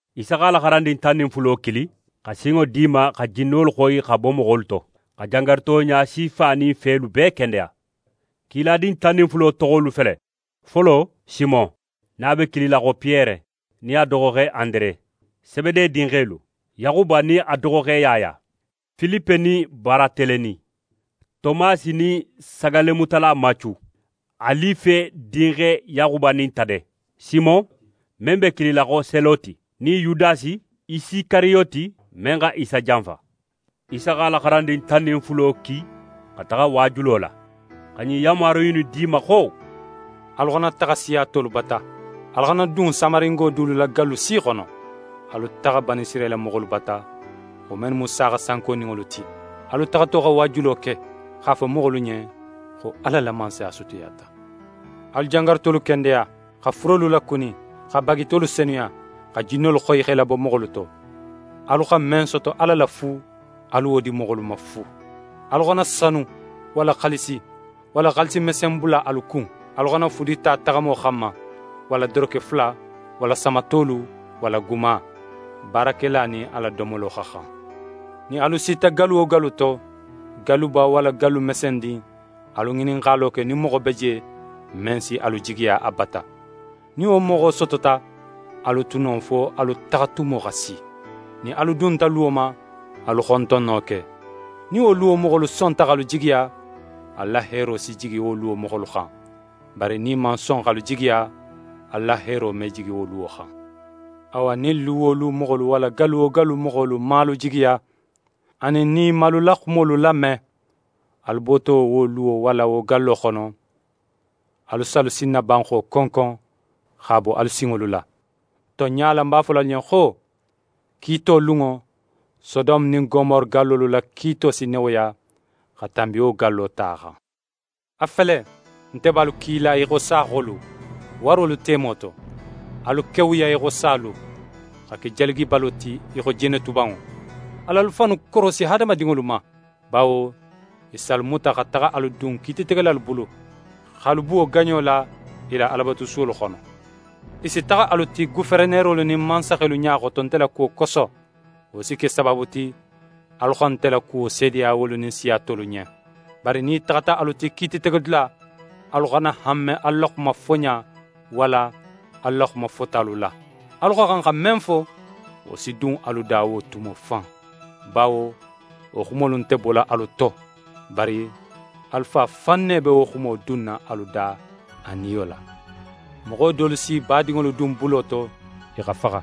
Isa x'a la xarandin tan nin fulo kili xa sinŋo di i ma xa jinnolu xoyi xa bo moxolu to, xa jangaruto ɲasifa nin felu bee kendeya. Kiladin tan nin fulo toxolu fele: Folo, Simon, nin a be kilila xo Piyere, nin a doxoxe Andere; Sebede dinxelu: Yaxuba nin a doxoxe Yaya; Filipe nin Baratelemi; Tomasi nin sagallemutala Macu; Alife dinxe Yaxuba nin Tade; Simon, men be kilila xo Seloti, nin Yudasi Isikariyoti men xa Isa janfa. Isa x'a la xarandin tan nin fulo ki xa taxa waajulo la, xa ɲin yanmaru innu di i ma xo: «Alu xana taxa siya tolu bata, alu xana dun Samaringo dulu la gallu si xono. Alu taxa Banisirayila moxolu bata, wo mennu mu saaxa sankoninŋolu ti. Alu taxato xa waajulo ke x'a fo moxolu ɲen xo Ala la Mansaya sutiyata. Alu jangarutolu kendeya, xa furelu lakuni, xa bagitolu senuya, xa jinnolu xoyi x'e labo moxolu to. Alu xa men soto Ala la fu, alu wo di moxolu ma fu. Alu xana sanu, walla xaalisi, walla xaalisi mesen bula alu kun. Alu xana fudi ta taxamo xanma, walla doroke fula, walla samatolu, walla guma. Baarakela nin a la domolo xa xan. «Nin alu sita gallu wo gallu to, galluba walla gallu mesendin, alu ŋininxalo ke nin moxo be je, men si alu jigiya a bata. Nin wo moxo sotota, alu tu non fo alu taxatumo xa si. Nin alu dunta luwo ma, alu xontonno ke. Nin wo luwo moxolu sonta x'alu jigiya, alu la heero si jigi wo luwo moxolu xan, bari nin i man son x'alu jigiya, alu la heero me jigi wo luwo xan. Awa, nin lu wo lu moxolu walla gallu wo gallu moxolu man alu jigiya, anin nin i man alu la xumolu lame, alu boto wo luwo walla wo gallo xono, alu si alu sinnabanxo konkon x'a bo alu sinŋolu la. Tonɲa la, ń b'a fola alu ɲen xo: Kiito lunŋo, Sodome nin Gomore gallolu la kiito si newoya xa tanbi wo gallo ta xan.» «A fele, nte be alu kila í xo saaxolu, warolu temo to. Alu kewuya í xo salu, xa ke jalagibalo ti í xo jenetubanŋo. Al'alu fannu korosi hadamadinŋolu ma, bawo i si alu muta xa taxa alu dun kiititegelalu bulu, x'alu buwo gaɲo la i la Alabatusuwolu xono. I si taxa alu ti goferenerolu nin mansaxelu ɲa xoto nte la kuwo koso. Wo si ke sabaabu ti, alu xa nte la kuwo seedeya wolu nin siya tolu ɲen. Bari nin i taxata alu ti kiititegedula, alu xana hanme alu la xuma foɲa walla alu la xuma fotalu la. Alu xa xan xa men fo, wo si dun alu da wo tumo fan. Bawo wo xumolu nte bola alu to, bari alu Fa fan ne be wo xumo dunna alu da a Niyo la. Moxo dolu s'i badinŋolu dun bulo to, i xa faxa;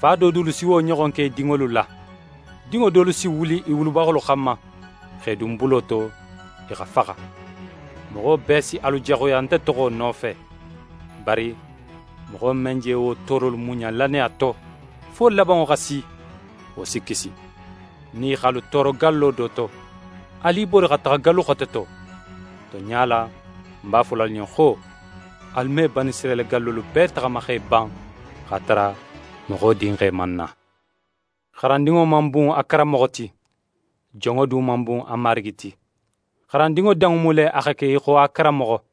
fa do dulu si wo ɲoxon ke i dinŋolu la. Dinŋo dolu si wuli i wulubaxolu xanma, x'e dun bulo to, i xa faxa. Moxo bee si alu jaxuya nte toxo nofe. Bari moxo men je wo toorolu muɲa lannaya to, fo labanŋo xa si, wo si kisi. Nin i x'alu tooro gallo do to, alu i bori xa taxa gallu xote to. Tonɲa la, ń b'a fola alu ɲen xo: Alu me Banisirayila gallolu bee taxama x'e ban, x'a tara Moxo Dinxe man na. «xarandinŋo man bun a karanmoxo ti, jonŋo du man bun a marigi ti. Xarandinŋo danŋo mu le a xa ke í xo a karanmoxo,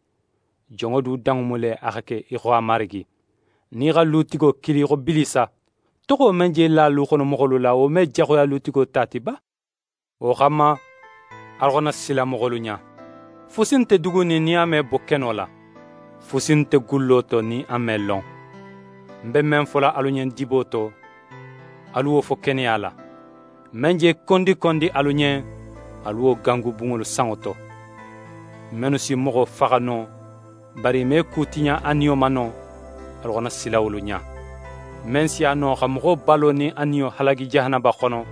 jonŋo du danŋo mu le a xa ke í xo a marigi. Nin i xa lutigo kili xo Bilisa, toxo men je la luxonomoxolu la, wo me jaxuya lutigo ta ti ba?» «Wo xanma, alu xana sila moxolu ɲa! Fusi nte dugunin nin a me bo keno la. Fusi nte gullo to nin a me lon. Ń be men fola alu ɲen dibo to, alu wo fo keneya la. Men je kondikondi alu ɲen, alu wo gangu bunŋolu sanŋo to. Mennu si moxo faxa no, bari i me ku tiɲa a niyo ma no, alu xana sila wolu ɲa. Men si a no xa moxo balo nin a niyo halagi jahanaba xono,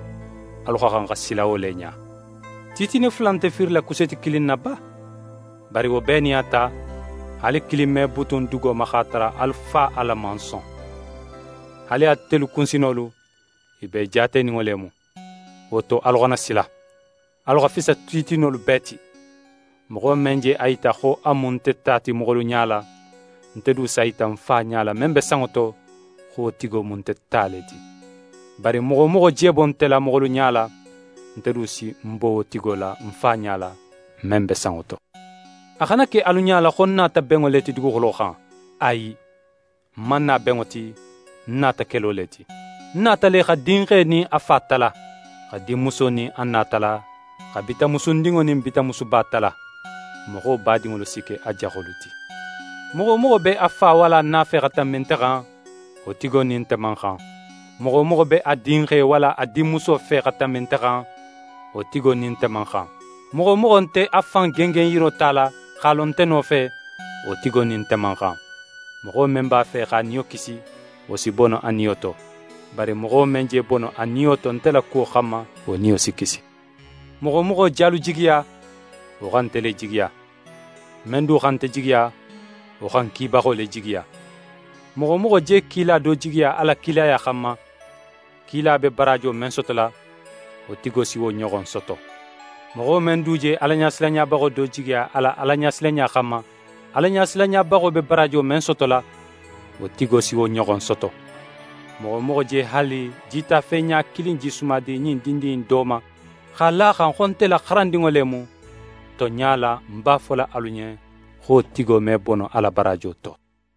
alu xa xan xa sila wo le ɲa. Titine fula nte fiirila kuseeti kilin na ba? Bari wo bee nin a ta, haali kilin me butun dugo ma x'a tara alu Fa Ala man son. Haali atelu kunsinolu, i bee jaateninŋo le mu. Wo to, alu xana sila. Alu xa fisa titinolu bee ti.» «Moxo men je a yita xo a mu nte ta ti moxolu ɲala, nte du s'a yita ń Fa ɲala, men be sanŋo to, xo wo tigo mu nte ta le ti. Bari moxo wo moxo je bo nte la, moxolu ɲala, nte du si ń bo wo tigo la ń Fa ɲala, men be sanŋo to.» «A xana ke alu ɲala xo ń nata benŋo le ti duguxulo xan. Ayi, ń man na benŋo ti, ń nata kelo le ti. Ń nata le xa dinxe nin a fa tala, xa dinmuso nin a na tala, xa bitanmusundinŋo nin bitanmusuba tala. Moxo badinŋolu si ke a jaxolu ti. Moxo wo moxo be a fa walla a na fe xa tanbi nte xan, wo tigo nin nte man xan. Moxo wo moxo be a dinxe walla a dinmuso fe xa tanbi nte xan, wo tigo nin nte man xan. Moxo wo moxo nte a fan gengenyiro tala, x'a lo nte nofe, wo tigo nin nte man xan. Moxo men b'a fe x'a niyo kisi, wo si bono a niyo to, bari moxo men je bono a niyo to nte la kuwo xanma, wo niyo si kisi.» «Moxo wo moxo je alu jigiya, wo xa nte le jigiya. Men du xa nte jigiya, wo xa ń kibaxo le jigiya. Moxo wo moxo je kila do jigiya a la kilaya xanma, kila be baraajo men sotola, wo tigo si wo ɲoxon soto. Moxo men du je Alaɲasilanɲabaxo do jigiya a la Alaɲasilanɲa xanma, Alaɲasilanɲabaxo be baraajo men sotola, wo tigo si wo ɲoxon soto. Moxo wo moxo je haali jitafe ɲa kilin jisuma di ɲin dindin innu do ma, x'a la a xan xo nte la xarandinŋo le mu, tonɲa la, ń b'a fola alu ɲen xo wo tigo me bono a la baraajo to.»